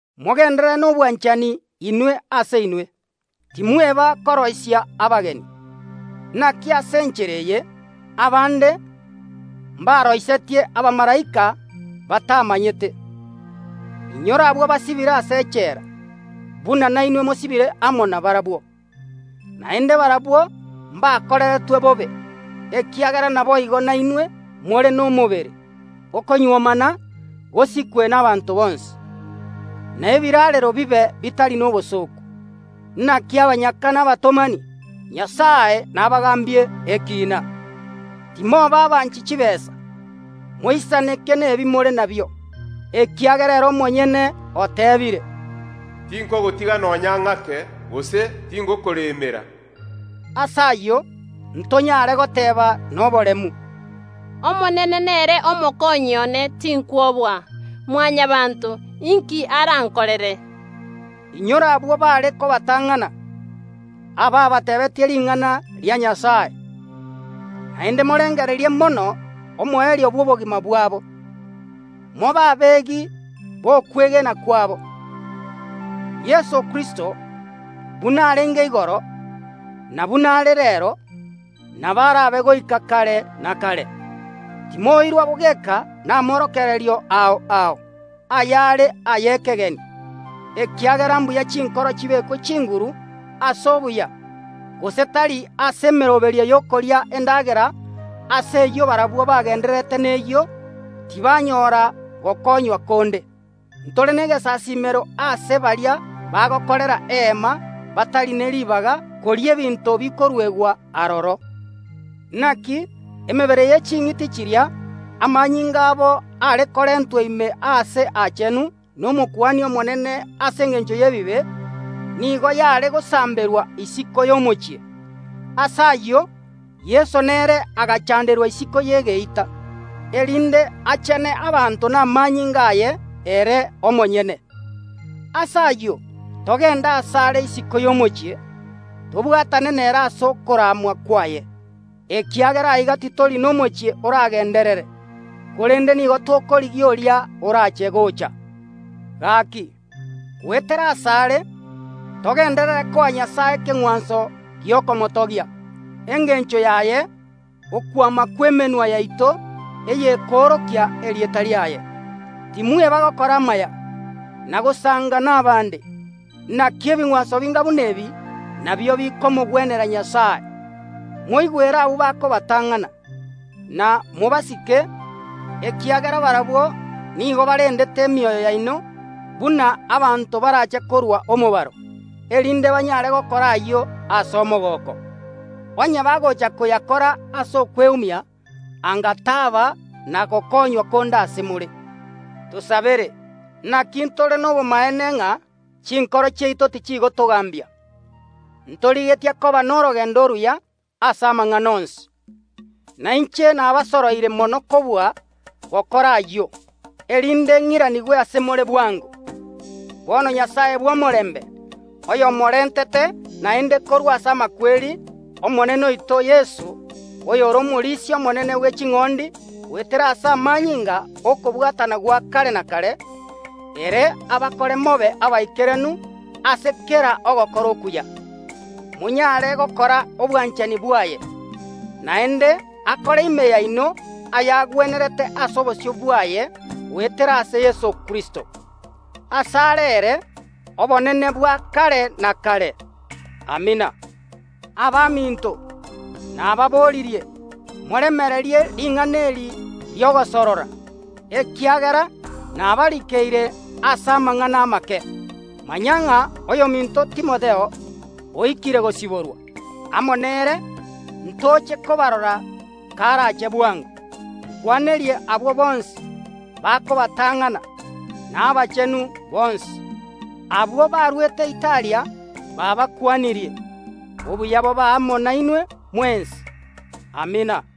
Mogenderere nobwanchani inwe ase inwe. Timweba koroisia abageni, naki ase enchera eye abande mbaroisetie abamalaika, batamanyete. Inyora abwo basibire ase echela, buna nainwe mosibire amo nabarabwo, naende barabwo mbakoreretwe bobe, ekiagera naboigo nainwe more nomobere. Okonyuomana gosikwe nabaanto bonsi, na ebiraarero bibe bitari nobosooku, naki abanyaka na abatomani Nyasae nabagaambie ekiina. Timoba abanchi chitaabu, moisaneke nebi more nabio, ekiagera ere omonyene oteebire, “Tinkogotiga nonya ng’ake, gose tingokoremera.” Ase ayio, ntonyare goteeba noboremu, “Omonene nere omokonyi one, tinkwoboa. Mwanyabaanto, inki arankorere?” Inyora abwo baare kobatang’ana, abaabateebetie ring’ana ria Nyasae. Naende morengererie mono omoerio bw’obogima bwabo, mobe abegi b’okwegena kwabo. Yeso Kristo buna arenge igoro, na buna are reero, nabo arabe goika kare na kare. Timoirwa bogeka namorokererio ao ao, ayare ay’ekegeni, ekiagera mbuya chinkoro chibekwe chinguru ase obuya, gose tari ase emeroberio y’okoria endagera ase eyio barabwo bagendererete neyio tibanyora gokonywa konde. Ntore negesasiimero aase baria bagokorera Eema batari ne ribaga koria ebinto bikoruegwa aroro. Naki emebere ye ching’iti chiria amanyinga abo are korentwa ime Aase Aachenu n’Omokuani omonene ase engencho y’ebibe, nigo yare gosamberwa isiko y’omochie. Ase ayio, Yeso nere agachanderwa isiko y’egeita, erinde achene abanto namanyinga aye ere omonyene. Ase ayio, togende asare isiko y’omochie, tobwatane nere ase okoramwa kwaye, ekiagera aiga titori nomochie oragenderere, korende nigo tokorigia oria orache gocha. Gaki, goetera asare togenderere koa Nyasae ekeng’wanso gi’okomotogia, engencho yaye okwama kw’emenwa yaito eyekoorokia erieta riaye. Timweba gokora amaya, na gosanga nabande, naki ebing’wanso binga buna ebi nabio bikomogwenera Nyasae. Moigwere abwo bakobatang’ana, na mobasike, ekiagera barabwo nigo barendete emioyo yaino buna abanto barache korua omobaro, erinde banyare gokora ayio ase omogooko. Onye bagocha koyakora ase okweumia anga taba na gokonywa konde ase more. Tosabere, naki ntore nobomaene ng’a chinkoro chiaito tichigotogambia, ntorigetie koba norogendo oruya ase amang’ana onsi. Na inche nabasoroire mono kobua gokora ayio, erinde ng’iranigwe ase more bwango. Bono Nyasae bw’omorembe oyomorentete naende korwa ase amakweri Omonene oito Yeso, oyore omorisia omonene bwe ching’ondi goetera ase amanyinga y’okobwatana gwa kare na kare, ere abakore mobe abaikeranu ase kera ogokora okuya, monyare gokora obwanchani bwaye, naende akore ime yaino ayagwenerete ase obosio bwaye goetera ase Yeso Kristo. Asare ere obonene bwa kare na kare. Amina. Abaminto, nababoririe, moremererie ring’ana eri ri’ogosorora, ekiagera nabarikeire ase amang’ana amake. Manya ng’a oyominto Timotheo oikire gosiborwa. Amo nere ntoche kobarora karache bwango. Nkwanerie abwo bonsi bakobatang’ana, na abachenu bonsi. Abwo baruete Italia baabakwanirie. Obuya bobe amo nainwe mwensi. Amina.